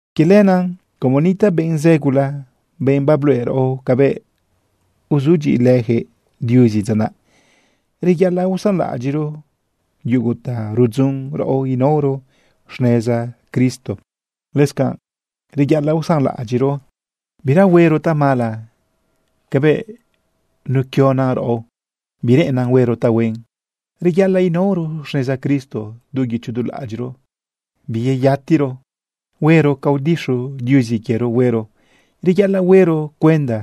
Quie lenaꞌ como nitaꞌ benꞌ zë gula, benꞌ babluꞌe raꞌo cabëꞌ uzudyiꞌilëjëꞌ Diuzi dza naꞌ, reyaꞌalaꞌ usanlaꞌadyiꞌro yugu ta rudzun raꞌo inaoro xneza Cristo. Lëscanꞌ reyaꞌalaꞌ usanlaꞌadyiꞌro bira huero tamala cabëꞌ nequionan raꞌo bireꞌennan huero tahuen. Reyaꞌalaꞌ inaoro xneza Cristo du guicho du laꞌadyiꞌro, biyeyatiro huero ca udixu Diuzi quiero huero. Reyaꞌalaꞌ huero cuenda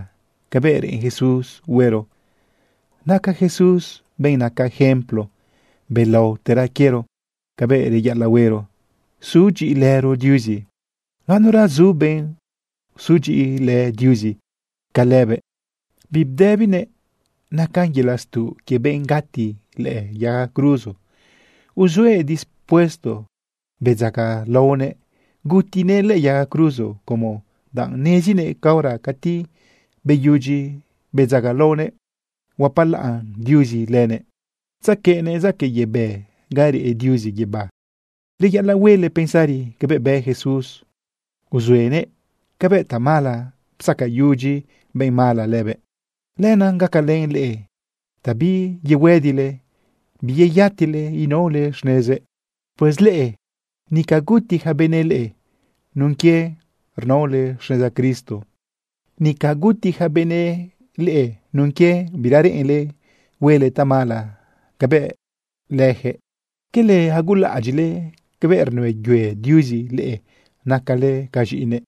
cabëꞌ reꞌen Jesús huero. Naca Jesús benꞌ naca ejemplo belaotera quiero cabëꞌ reyaꞌalaꞌhuero sudyiꞌilëro Diuzi. Ganura zu benꞌ uzudyiꞌilë Diuzi ca lëbëꞌ. Bibdëbinëꞌ nacan yelaꞌ stuꞌ quie benꞌ gati lëꞌë yaga cruzo. Uzuëꞌ dispuesto bedzagalaonëꞌ gutinëꞌ lëꞌë yaga cruzo, como danꞌ nezinëꞌ caora cati beyudyi bedzagalaonëꞌ, huapalaꞌn Diuzi lëbëꞌ tzequeꞌnëꞌ zaquëꞌ yebë ga reꞌ Diuzi guibá. Reyaꞌalaꞌ huele pensari cabëꞌ bë Jesús uzuenëꞌ cabëꞌ tamala psacayudyi benꞌ mala lëbëꞌ. Lenaꞌ gacalën leꞌe ta biyehuëdile biyeyatile inaole xnezëꞌ. Pues leꞌe, nica guti ja benëꞌ leꞌe nun quie rnaole xneza Cristo. Nica guti ja benëꞌ leꞌe nun quie bira reꞌenle huele tamala cabëꞌ lëjëꞌ. ¿Quele agulaꞌadyiꞌle cabëꞌ rnëyue Diuzi leꞌe nacale ca z̃iꞌinëꞌ?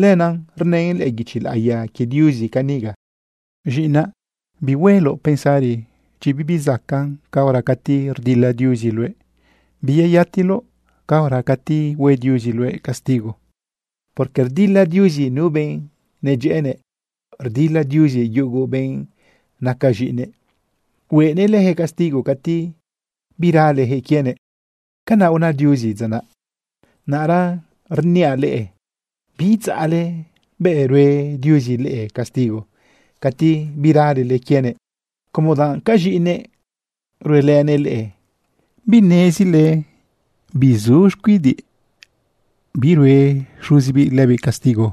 Lenaꞌ rnën lëꞌë guichi laꞌiya quie Diuzi caniga: Z̃iꞌinaꞌ, bihuele pensari chi bibi zacaꞌn caora cati rdila Diuzi luëꞌ. Biyeyatile caora cati hue Diuzi luëꞌ castigo. Porque rdila Diuzi nu benꞌ nedyëꞌënëꞌ, rdila Diuzi yugu benꞌ naca z̃iꞌinëꞌ, huenëꞌ lëjëꞌ castigo cati biralejëꞌ quienëꞌ. Canaꞌ una Diuzi dza naꞌ. Naꞌra rniaꞌ leꞌe biidzaꞌle bëꞌ rue Diuzi leꞌe castigo cati biralele quienëꞌ, como danꞌ ca z̃iꞌinëꞌ ruelënëꞌ leꞌe. ¿Binezile bizu xcuidiꞌ birue xuzibiꞌ lëbiꞌ castigo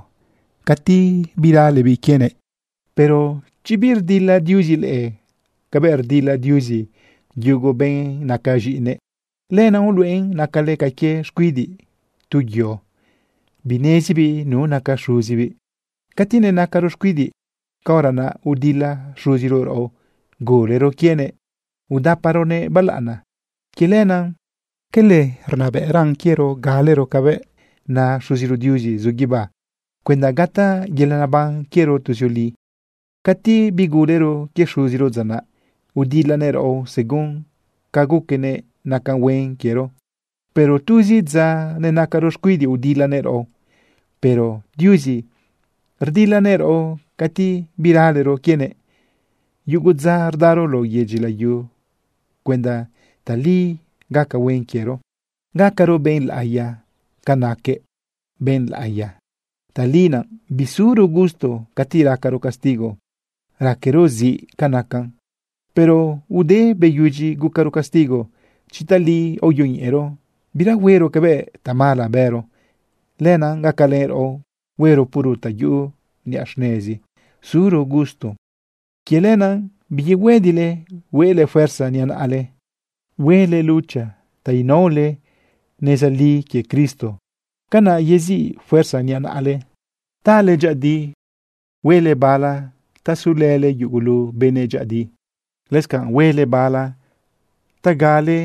cati biralebiꞌ quienëꞌ? Pero chi birdila Diuzi leꞌe cabëꞌ rdila Diuzi yugu benꞌ naca z̃iꞌinëꞌ, lenaꞌ uluꞌen nacale ca quie xcuidiꞌ tu yo, binezibiꞌ nu naca xuzibiꞌ. Cati nenacaro xcuidiꞌ, caora naꞌ udila xuziro raꞌo gulero quienëꞌ udaparonëꞌ balaꞌana. Quie lenaꞌ, ¿quele rnabëꞌran quiero galero cabëꞌ na Xuziro Diuzi zu guibá cuenda gataꞌ yelaꞌ neban quiero tuzioli? Cati bigulero quie xuziro dza naꞌ, udilanëꞌ raꞌo según ca guquenëꞌ nacan huen quiero, pero tuzi dza nenacaro xcuidiꞌ udilanëꞌ raꞌo. Pero Diuzi rdilanëꞌ raꞌo cati biralero quienëꞌ yugu dza rdaro lao yedyi layu cuenda tali gaca huen quiero, gacaro benꞌ laꞌiya ca naquëꞌ benꞌ laꞌiya. Tali naꞌ bisuro gusto cati racaro castigo, raquero ziꞌ ca nacan. Pero ude beyudyi gucaro castigo, chi tali aoyoñeꞌero, bira huero cabëꞌ tamala bëro. Lenaꞌ gacalën raꞌo huero puro ta yuꞌu niꞌa xnezi suro gusto. Quie lenaꞌ biyehuëdile huele fuerza niꞌa naꞌale. Huele lucha ta unaole neza li quie Cristo. Canaꞌ yeziꞌ fuerza niꞌa naꞌale tale dyëꞌëdi. Huele bala ta sulële yugulu benëꞌ dyëꞌëdi. Lëscanꞌ huele bala ta gacale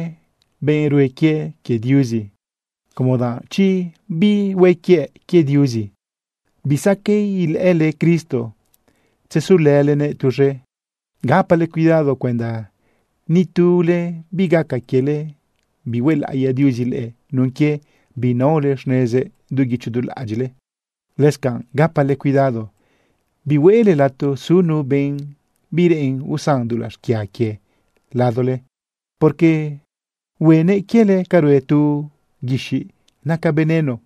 benꞌ rue quie quie Diuzi, como danꞌ chi bihue quie quie Diuzi, bisaqueꞌ ilëꞌële Cristo tzesulëlenëꞌ tuz̃e. Gapale cuidado cuenda ni tule bigaca quiele bihuelaꞌiya Diuzi leꞌe nun quie binaole xnezëꞌ du guicho du laꞌadyiꞌle. Lëscanꞌ gapale cuidado bihuele lato su nu benꞌ bireꞌen usan dulaꞌ xquia quie ladole, porque huenëꞌ quiele ca rue tu guixiꞌ naca veneno,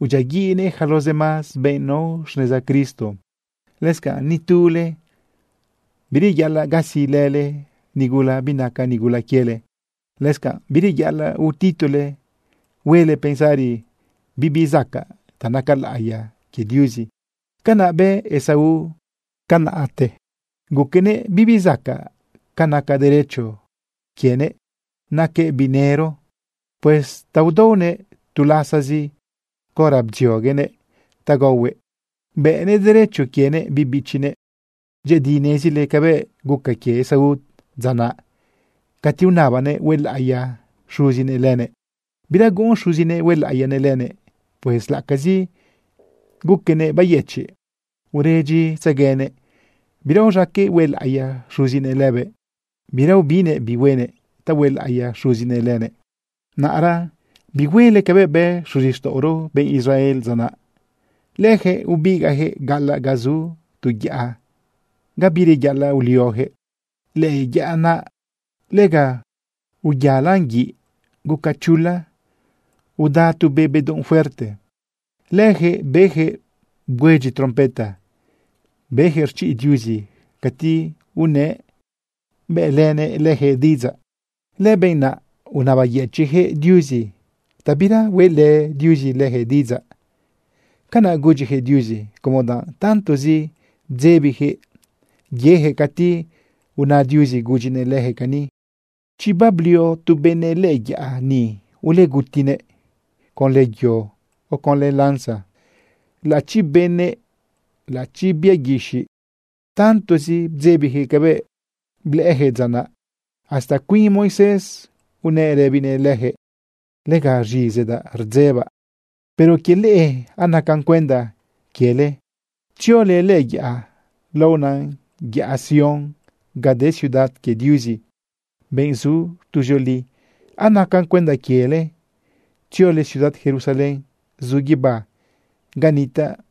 udyiaguiꞌnëꞌ yaca los demás benꞌ nao xneza Cristo. Lëscanꞌ ni tu leꞌe, bireyaꞌalaꞌ gasilële nigula binaca nigula quiele. Lëscanꞌ bireyaꞌalaꞌ utitole huele pensari bibi zacaꞌ ta naca laꞌiya quie Diuzi. Canaꞌ bë Esaú tiempote guquenëꞌ bibizacaꞌ ca naca derecho quienëꞌ naquëꞌ biꞌ nëro. Pues ta udaonëꞌ tu lasazi caora bdzioguenëꞌ ta gaohuëꞌ, bëꞌnëꞌ derecho quienëꞌ biꞌ bichinëꞌ. Dyëꞌëdi nezile cabëꞌ guca quie Esaú dza naꞌ. Cati unabanëꞌ huelaꞌiya xuzinëꞌ lëbëꞌ, bira guꞌun xuzinëꞌ huelaꞌiyanëꞌ lëbëꞌ. Pues laꞌacazi guquenëꞌ bayëchiꞌ uredyitzeguenëꞌ, bira uz̃aqueꞌ huelaꞌiya xuzinëꞌ lëbëꞌ. Bira ubinnëꞌ bi huenëꞌ ta huelaꞌiya xuzinëꞌ lëbëꞌ. Naꞌra bihuele cabëꞌ bë xuzixtaꞌoro benꞌ Israel dza naꞌ. Lëjëꞌ ubigaꞌjëꞌ gaꞌalaꞌ ga zu tu yaꞌa ga bireyaꞌalaꞌ uliojëꞌ. Lëꞌë yaꞌa naꞌ lega uyaꞌalaꞌn guiꞌ, guca chula, uda tu be bedunꞌ fuerte. Lëjëꞌ bejëꞌ bgüedyi trompeta, bejëꞌ rchiꞌ Diuzi cati unëꞌ bëꞌlënëꞌ lëjëꞌ diꞌidzaꞌ. Lëbenꞌ naꞌ unabayëchiꞌjëꞌ Diuzi ta bira hueꞌlë Diuzi lëjëꞌ diꞌidzaꞌ. Canaꞌ gudyijëꞌ Diuzi, como danꞌ tantozi bdzebijëꞌ yejëꞌ cati una Diuzi gudyinëꞌ lëjëꞌ cani: “Chi bablio tu benëꞌ lëꞌë yaꞌa ni, ulegutinëꞌ conlë yo o conlë lanza, laꞌachi benëꞌ, laꞌachi bia guixiꞌ.” Tantozi bdzebijëꞌ cabëꞌ blëꞌëjëꞌ dza naꞌ, hasta cuin Moisés unëꞌ rëbinëꞌ lëjëꞌ: “Lega rz̃izidaꞌ rdzebaꞌ.” Pero quie leꞌe, anacan cuenda quiele tziole lëꞌë yaꞌa laona yaꞌa Sión ga de ciudad quie Diuzi, benꞌ zu tuzioli. Anacan cuenda quiele tziole ciudad Jerusalén zu guibá ga nitaꞌ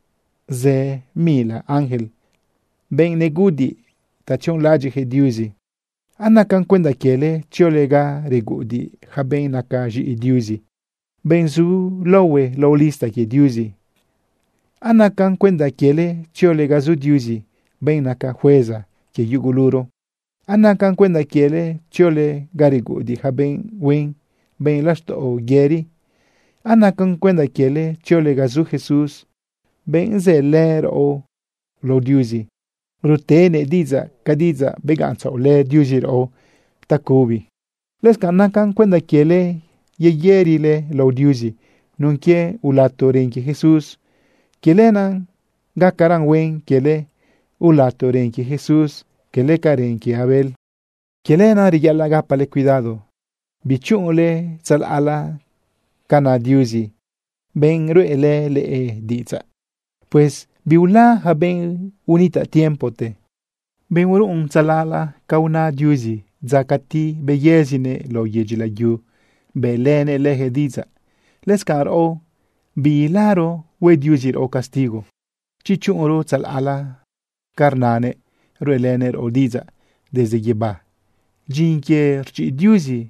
zë mila ángel, benꞌ neguꞌudiꞌ ta tzionlaꞌadyiꞌjëꞌ Diuzi. Anacan cuenda quiele tziole ga reguꞌudiꞌ yaca benꞌ naca z̃iꞌi Diuzi, benꞌ zu laohue lao lista quie Diuzi. Anacan cuenda quiele tziole ga zu Diuzi, benꞌ naca jueza quie yuguluro. Anacan cuenda quiele tziole ga reguꞌudiꞌ yaca benꞌ huen, benꞌ laxtaꞌo yëri. Anacan cuenda quiele tziole ga zu Jesús, benꞌ zëlë raꞌo lao Diuzi rutenëꞌ diꞌidzaꞌ ca diꞌidzaꞌ begaꞌntzaꞌolë Diuzi raꞌo tacubi. Lëscanꞌ naca cuenda quiele yeyërile lao Diuzi nun quie ulato ren quie Jesús. Quie lenaꞌ gacaran huen quiele ulato ren quie Jesús, cala ca ren quie Abel. Quie lenaꞌ reyaꞌalaꞌ gapale cuidado bichuꞌunle tzalaꞌla ca na Diuzi, benꞌ ruꞌelë leꞌe diꞌidzaꞌ. Pues biula yaca benꞌ unitaꞌ tiempote, benꞌ uruꞌun tzalaꞌla ca una Diuzi dza cati beyëzinëꞌ lao yedyi layu bëꞌlënëꞌ lëjëꞌ diꞌidzaꞌ. Lëscanꞌ raꞌo, biilaro hue Diuzi raꞌo castigo chi chuꞌunro tzalaꞌla ca rnanëꞌ ruꞌelënëꞌ raꞌo diꞌidzaꞌ desde guibá. Dyin quie rchiꞌ Diuzi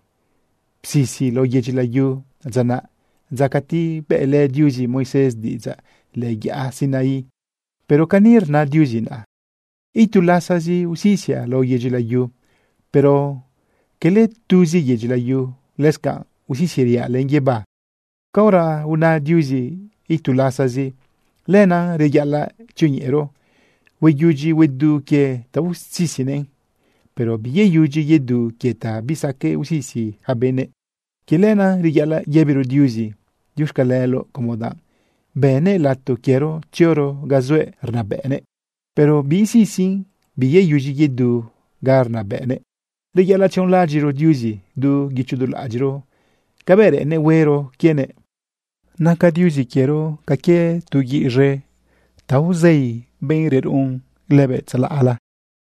psisi lao yedyi layu dza naꞌ, dza cati bëꞌlë Diuzi Moisés diꞌidzaꞌ lëꞌë yaꞌa Sinaí. Pero cani rna Diuzi naꞌa: “Itu lasazi usisiaꞌ lao yedyi layu, pero quele tuzi yedyi layuzi, lëscanꞌ usisiriaꞌ lente guibá.” Caora una Diuzi “itu lasazi”, lenaꞌ reyaꞌalaꞌ tzioñeꞌero hueyudyi huedu quie ta usisinëꞌn, pero biyeyudyi yedu quie ta bisaqueꞌ usisi yaca benëꞌ. Quie lenaꞌ reyaꞌalaꞌ yëbiro Diuzi diuxcaleloꞌ, como danꞌ bënnëꞌ lato quiero tzioro ga zuëꞌ rnabëꞌnëꞌ, pero biisisin biyeyudyi yedu ga rnabëꞌnëꞌ. Reyaꞌalaꞌ tzionlaꞌadyiꞌro Diuzi du guicho du laꞌadyiꞌro cabëꞌ reꞌennëꞌ huero quienëꞌ. Naca Diuzi quiero ca quie tu guiꞌ z̃e ta tzei benꞌ reruꞌun lëbëꞌ tzalaꞌla.